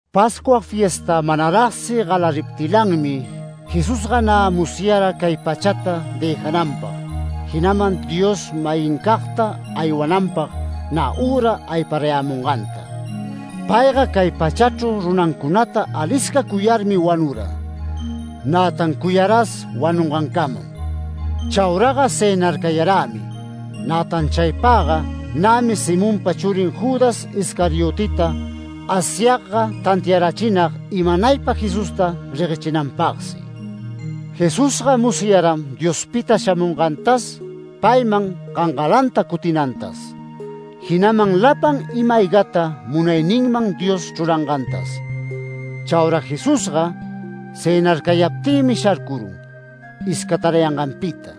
Pascua fiesta manaragsi galariptilanmi Jesusga nä musyara cay pachata dëjananpag, jinaman Dios-mayincagta aywananpag nä üra ayparayämunganta. Payga cay pachachru runancunata alisca cuyarmi wanura, nätan cuyaras wanungancamam. Chauraga cënarcayarämi, nätan chaypagga nämi Simonpa churin Judas Iscarioteta Asyagga tantiarachinag imanaypa Jesusta reguechinanpagsi. Jesusga musyaram Diospita shamungantas payman gangalanta cutinantas, jinaman lapan ima-aygata munayninman Dios chrurangantas. Chaura Jesusga cënarcayaptïmi sharcurun iscatarayanganpita.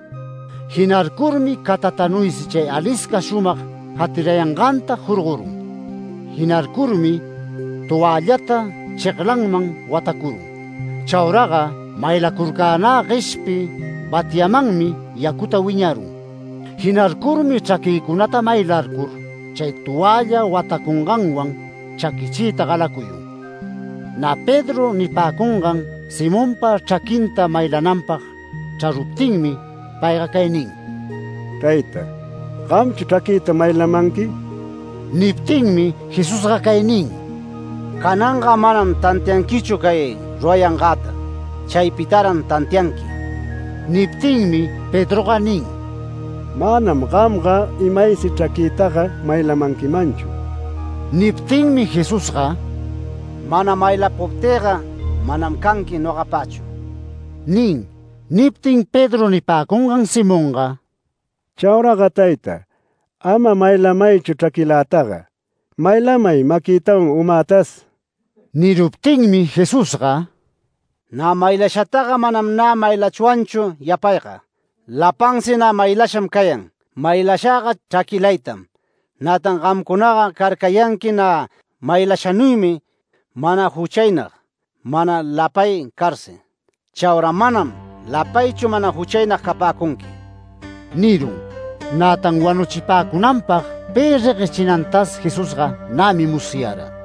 Jinarcurmi catatanuysi chay alisca shumag jatirayanganta jorgorun. Jinarcurmi toällata cheglanman watacurun. Chauraga maylacurcänä gueshpi batyamanmi yacuta wiñarun. Jinarcurmi chraquïcunata maylarcur chay toälla watacunganwan chaquichiyta galacuyun. Nä Pedro nipäcungan Simonpa chraquinta maylananpag chraruptinmi payga cay nin: “Tayta, ¿gamchu chraquïta maylamanqui?” Niptinmi Jesusga cay nin: “Cananga manam tantianquichu cay rurayangäta. Chaypitaran tantianqui”. Niptinmi Pedroga nin: “Manam gamga imaysi chraquïtaga maylamanquimanchu”. Niptinmi Jesusga “Mana maylapuptïga manam canqui nogapachu” nin. Niptin Pedro nipäcungan Simonga: “Chauraga tayta, ama maylamaychu chraquïlataga, maylamay maquïtawan umätas”. Niruptinmi Jesusga “Nä maylashataga manam nä maylachwanchu yapayga. Lapansi nä maylasham cayan. Maylashäga chraquilaytam. Nätan gamcunaga carcayanqui nä maylashanuymi mana juchaynag, mana lapay carsi. Chaura manam lapaychu mana juchaynag capäcunqui” nirun, nätan wanuchipäcunanpag pi reguechinantas Jesusga nämi musyara.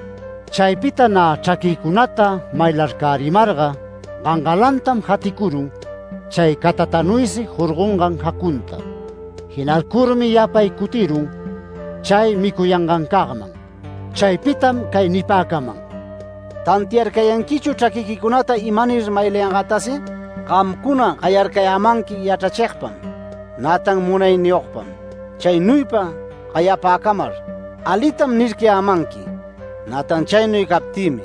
Chaypita nä chraquïcunata maylarcärimarga gangalantam jaticurun chay catatanuysi jorgongan jacunta. Jinarcurmi yapay cutirun chay micuyangancagman. Chaypitam cay nipäcaman: “¿Tantiarcayanquichu chraquiquicunata imanir maylangätasi? Gamcuna gayarcayämanqui ‘Yachrachigpam’, nätan ‘Munayniyogpam’. Chaynuypa gayapäcamar, alitam nircayämanqui, nätan chaynuy captïmi.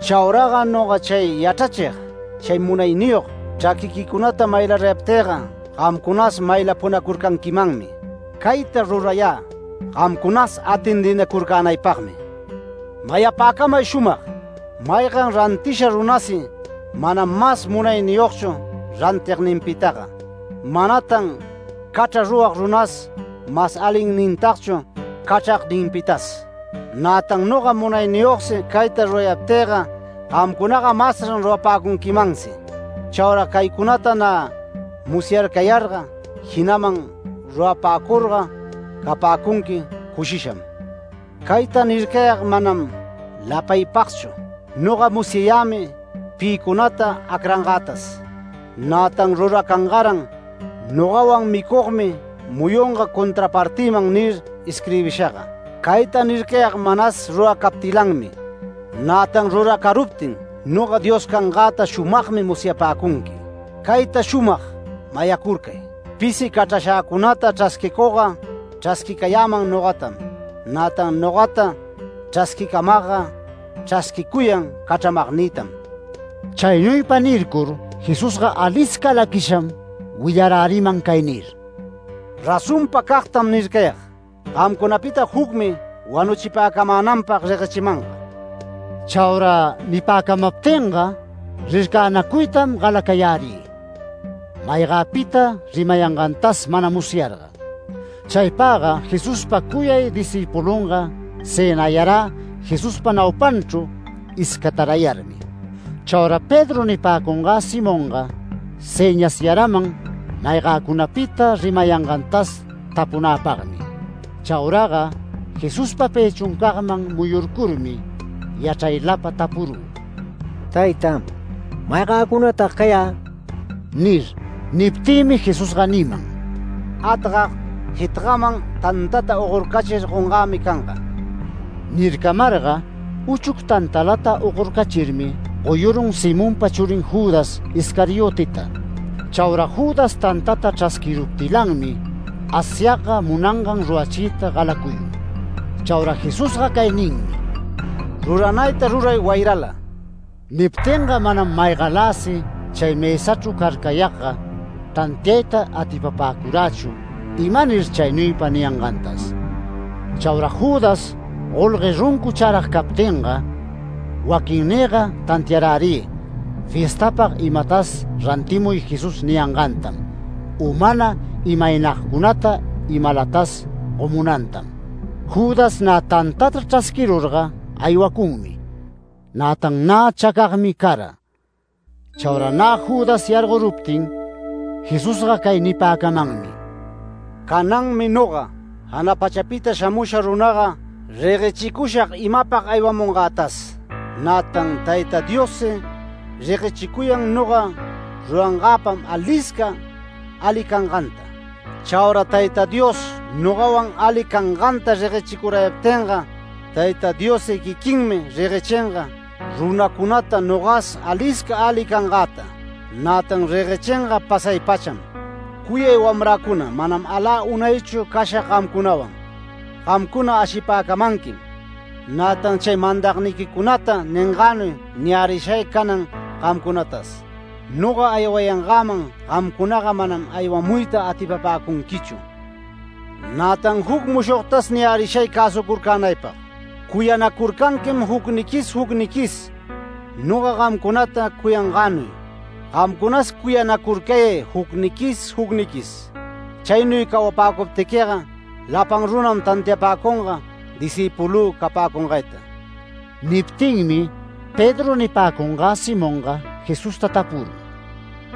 Chauraga noga chay yachrachig, chay munayniyog, chraquiquicunata maylarayaptïga gamcunas maylapunacurcanquimanmi. Cayta rurayä gamcunas atendinacurcänaypagmi. Mayapäcamay shumag: Maygan rantisha runasi manam mas munayniyogchu rantigninpitaga. Manatan cachra rurag runas mas alinnintagchu cachragninpitas. Nätan noga munayniyogsi cayta rurayaptïga gamcunaga masran rurapäcunquimansi. Chaura caycunata nä musyarcayarga, jinaman rurapäcurga capäcunqui cushisham. Cayta nircayag manam lapaypagchu. Noga musyayämi pïcunata acrangätas, nätan ruracangaran ‘Nogawan micugmi muyunga contrapartinman’ nir isquirbishaga. Cayta nircayag manas ruracaptilanmi, nätan ruracaruptin noga Dios cangäta shumagmi musyapäcunqui. Cayta shumag mayacurcay: Pisi cachrashäcunata chrasquicugga, chrasquicayäman nogatam, nätan nogata chrasquicamagga chrasquicuyan cachramagnïtam”. Chaynuypa nircur Jesusga alisca laquisham willaräriman cay nir: “Razonpacagtam nircayag, gamcunapita jucmi wanuchipäcamänanpag reguechimanga”. Chaura nipäcamaptinga rircanacuytam galacayärï maygäpita rimayangantas mana musyarga. Chaypagga Jesuspa cuyay discïpulunga cënayarä Jesuspa naupanchru iscatarayarmi. Chaura Pedro nipäcungä Simonga sëñasyaraman maygäcunapita rimayangantas tapunäpagmi. Chauraga Jesuspa pëchuncagman muyurcurmi yachraylapa tapurü: “Tayta, ¿maygäcunatag cayä?” nir. Niptïmi Jesusga niman: “Atgag jitagman tantata ogorcachir gongämi canga” nircamarga, uchuc tantalata ogorcachirmi goyurun Simonpa churin Judas Iscarioteta. Chaura Judas tantata chrasquiruptilanmi Asyagga munangan rurachiyta galacuyun. Chaura Jesusga cay ninmi: “Ruranayta ruray wayrala”. Niptinga manam maygaläsi chay mësachru carcayagga tantiayta atipapäcurachu imanir chaynuypa niyangantas. Chaura Judas golgue runcu charag captinga waquinnïga tantiarärï fiestapag imatas rantimuy Jesús niyangantam u mana imaynagcunata imalatas gomunantam. Judas nä tantata chrasquirurga aywacunmi, nätan nä chacagmi cara. Chaura nä Judas yargoruptin Jesusga cay nipäcamanmi: “Cananmi noga, jana pachapita shamusha runaga reguechicushag imapag aywamungätas, nätan Tayta Diossi reguechicuyan noga rurangäpam alisca ali canganta. Chaura Tayta Dios nogawan ali canganta reguechicurayaptinga, Tayta Diossi quiquinmi reguechinga runacunata nogas alisca ali cangäta, nätan reguechinga pasay-pacham. Cuyay wamräcuna manam alä unaychu cashag gamcunawan. Gamcuna ashipäcamanquim, nätan chay mandagniquicunata ningänuy niyärishay canan gamcunatas: Noga aywayangäman gamcunaga manam aywamuyta atipapäcunquichu. Nätan juc mushogtas niyärishay cäsucurcänaypag: Cuyanacurcanquim jucniquis jucniquis noga gamcunata cuyangänuy, gamcunas cuyanacurcayay jucniquis jucniquis. Chaynuy cawapäcuptiquiga lapan runam tantiapäcunga discïpulü capäcungayta”. Niptinmi Pedro nipäcungä Simonga Jesusta tapurun: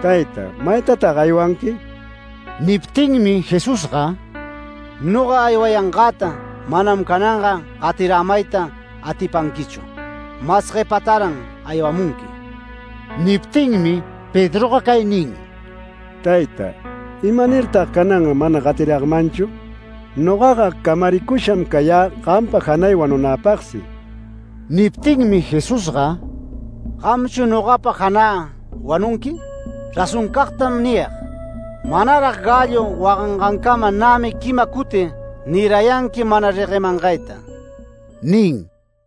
“Tayta, ¿maytatag aywanqui?”. Niptinmi Jesusga “Noga aywangätaga manam cananga gatirämayta atipanquichu. Mas guepätaran aywamunqui”. Niptinmi Pedroga cay nin: “Tayta, ¿imanirtag canan mana gatiragmanchu? Nogaga camaricusham cayä gampa janay wanunäpagsi”. Niptinmi Jesusga “¿Gamchu nogapa janä wanunqui? Razonpacagtam niyag, manarag gallo wagangancama nämi quima cuti nirayanqui mana reguemangayta” nin.